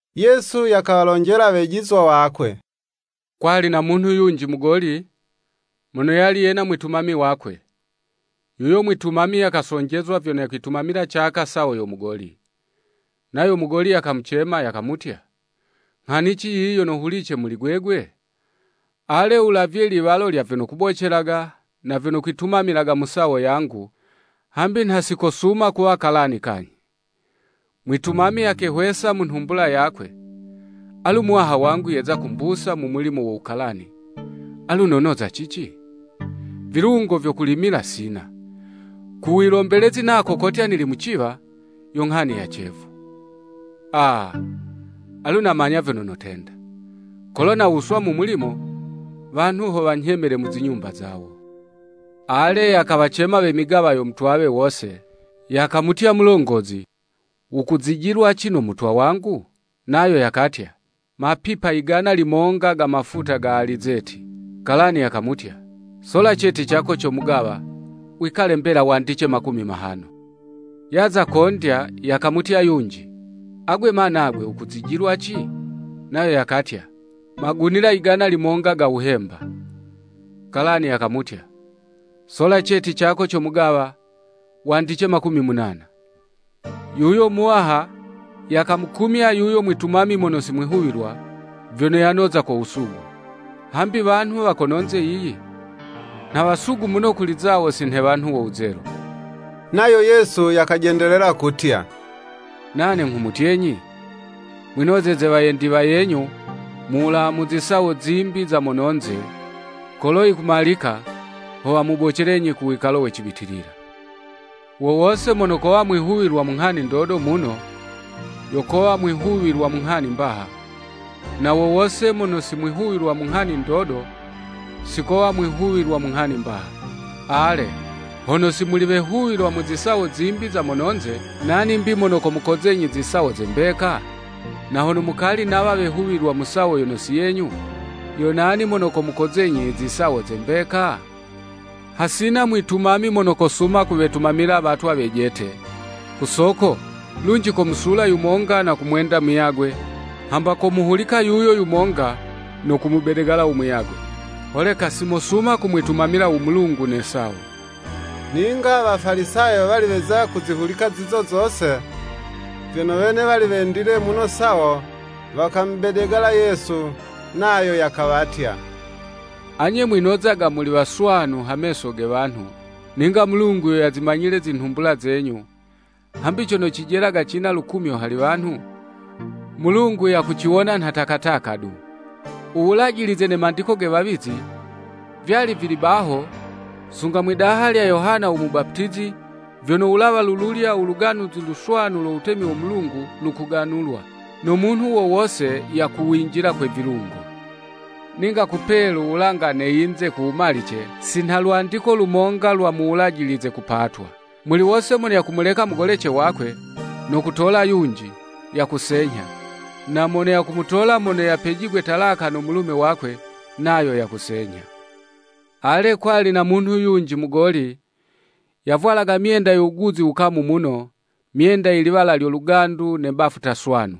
Yesu yakawalonjela wejizwa wakwe, “Kwali na munhu yunji mugoli, mono yali yena mwitumami wakwe; yuyo mwitumami yakasonjezwa vyono yakwitumamila caka sawo yo mugoli. Nayo mugoli yakamucema, yakamutya, nghanici yiyi yono hulice muli gwegwe?” Ale wulavye liwalo lya vyono kubocelaga, na vyono kwitumamilaga mu sawo yangu, hambi nha si kosuma kuwa kalani kanyhi. Mwitumami yakehwesa mu nhumbula yakwe, alu muwaha wangu yeza kumbusa mu mulimo wo wukalani, alu nonoza cici? Vilungo vyo kulimila sina; ku wilombelezi nako kotya nili muciwa, yo nghani ya cevu. Aa! Alu namanya vyono notenda, kolo nawuswa mu mulimo, wanhu ho wanyhemele mu zinyumba zawo. Ale, yakawacema we migawa yo mutwawe wose, yakamutya mulongozi, “Wukuzijilwaci no mutwa wangu?” Nayo yakatya, “Mapipa yigana limonga ga mafuta ga alizeti.” Kalani yakamutya, “Sola ceti cako co mugawa, wikale mbela wandice makumi mahano.” Yaza kondya, yakamutya yunji, “Agwe ma nagwe, wukuzijilwaci?” Nayo yakatya, “Magunila yigana limonga ga wuhemba.” Kalani yakamutya, “Sola ceti cako co mugawa, wandice makumi munana.” Yuyo muwaha, yakamukumya yuyo mwitumami mono si mwihuwilwa, vyono yanoza ko wusugu. Hambi wanhu wa kononze yiyi, nha wasugu muno kuli zawo si nhe wanhu wo wuzelu. Nayo Yesu yakajendelela kutya. “Nane nghumutyenyi, Mwinozeze wayendi wayenyu mu wulawa mu zisawo zimbi za mononze, kolo yikumalika, ho wamubocelenyi ku wikalo we cibitilila.” Wo wose mono kowa mwihuwilwa mu nghani ndodo muno, yo kowa mwihuwilwa na mu nghani mbaha, na wo wose mono si mwihuwilwa mu nghani ndodo, si kowa mwihuwilwa mu nghani mbaha. Ale, hono si muli wehuwilwa mu zisawo zimbi za mononze, nani 'mbi mono komukozenyi zisawo ze mbeka? Na hono mukali nawa wehuwilwa mu sawo yono si yenyu, yo nani mono komukozenyi i zisawo ze mbeka? “Hasina mwitumami mono kosuma kuwetumamila watwa wejete, ku soko, lunji komusula yumonga na kumwenda muyagwe, hamba komuhulika yuyo yumonga no kumubedegala u muyagwe. Holeka si mosuma kumwitumila u Mulungu ne sawo.” Ninga Wafalisayo wali weza kuzihulika zizo zose, vyono wene wali wendile muno sawo, wakamubedegala Yesu. Nayo yakawatya, “Anye mwinozaga muli waswanu ha meso ge wanhu, ninga Mulungu yo yazimanyile zinhumbula zenyu, hambi cono cijelaga cina lukumyo hali wanhu, Mulungu yakuciwona nha takataka du.” U Wulajilize ne mandiko ge wawizi, vyali vili baho, sunga mwidaha lya Yohana u Mubaputizi, vyono wulawa lululya u Luganuzi Luswanu lo wutemi wo Mulungu lukuganulwa, no munhu wo wose yakuwinjila kwe vilungo. Ninga kupelu wulanga ne yinze kuwumalice, si nha lwandiko lumonga lwa mu Wulajilize kupatwa. Muli wose mono yakumuleka mugolece wakwe, no kutola yunji, yakusenyha, nayo mono yakumutola mono yapejigwe talaka no mulume wakwe, nayo yakusenyha. Ale, kwali na munhu yunji mugoli, yavwalaga myenda yo wuguzi wukamu muno, myenda ye liwala lyo lugandu na bafuta swanu.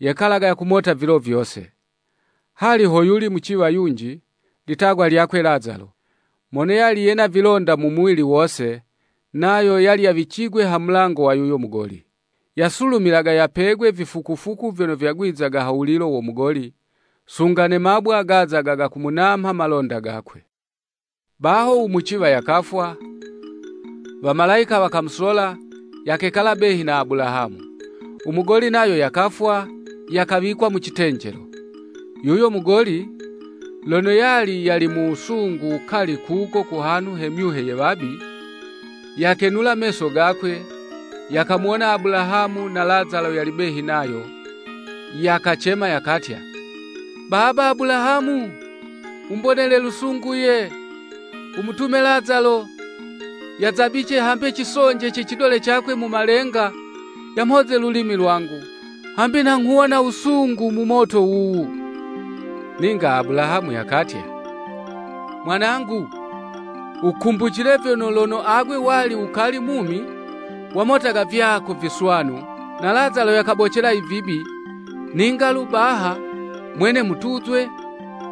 Yekalaga yakumota vilo vyose. Hali ho yuli muciwa yunji, litagwa lyakwe Lazalo, mono yali yena vilonda mu muwili wose, nayo yali yawicigwe ha mulango wa yuyo mugoli. Yasulumilaga yapegwe vifukufuku vyono vyagwizaga ha wulilo wo mugoli, sunga ne mabwa, gazaga gakumunamha malonda gakwe. “Baho u muciwa yakafwa, wamalayika wakamusola, yakekala behi na Abulahamu, u mugoli nayo yakafwa, yakawikwa mu citenjelo. Yuyo mugoli, lono yali yali mu wusungu wukali kuko ku hanhu ha myuhe ye wabi, yakenula meso gakwe, yakamuwona Abulahamu, na Lazalo yali behi nayo, Yakacema yakatya, ‘Baba Abulahamu, wumbonele lusungu ye, wumutume Lazalo, yazabice hambe cisonje ce cidole cakwe mu malenga, yamhoze lulimi lwangu; hambi nha nghuwona wusungu mu moto wuwu.’ Ninga Abulahamu yakatya, ‘Mwanangu, wukumbucile vyono, lono agwe wali wukali mumi, wamotaga vyako viswanu, na Lazalo yakabocela i vibi, ninga lu baha mwene mutuzwe,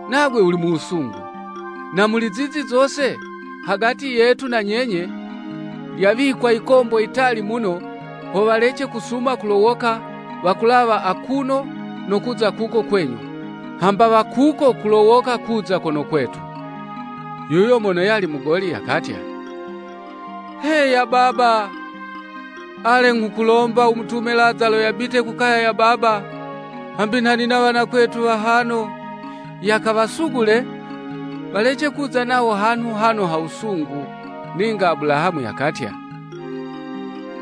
nagwe wuli mu wusungu. Na muli zizi zose, hagati yetu na nyenye, lyawikwa likombo yitali muno, ho walece kusuma kulowoka, wakulawa akuno no kuza kuko kwenyu, hamba wa kuko kulowoka kuza kono kwetu.’ Yuyo mono yali mugoli, yakatya, ‘Heya baba, ale nghukulomba, wumutume Lazalo yabite ku kaya ya Baba, hambi nha nina wanakwetu wahano; yakawasugule, walece kuza nawo hanhu hano ha wusungu.’ Ninga Abulahamu yakatya,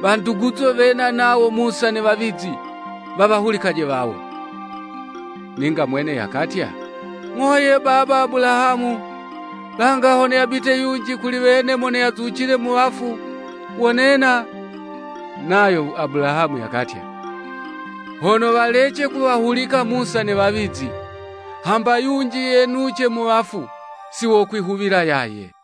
‘Wanduguzo, wena nawo wa Musa ne Wawizi, wawahulice wawo.’ Ninga mwene yakatya, ‘Ng'o ye baba Abulahamu; langa hono yabite yunji kuli wene mono yazucile mu wafu, wonena.’ Nayo Abulahamu yakatya, ‘Hono walece kuwahulika Musa ne Wawizi, hamba yunji yenuce mu wafu, si wokwihuwila yaye.’”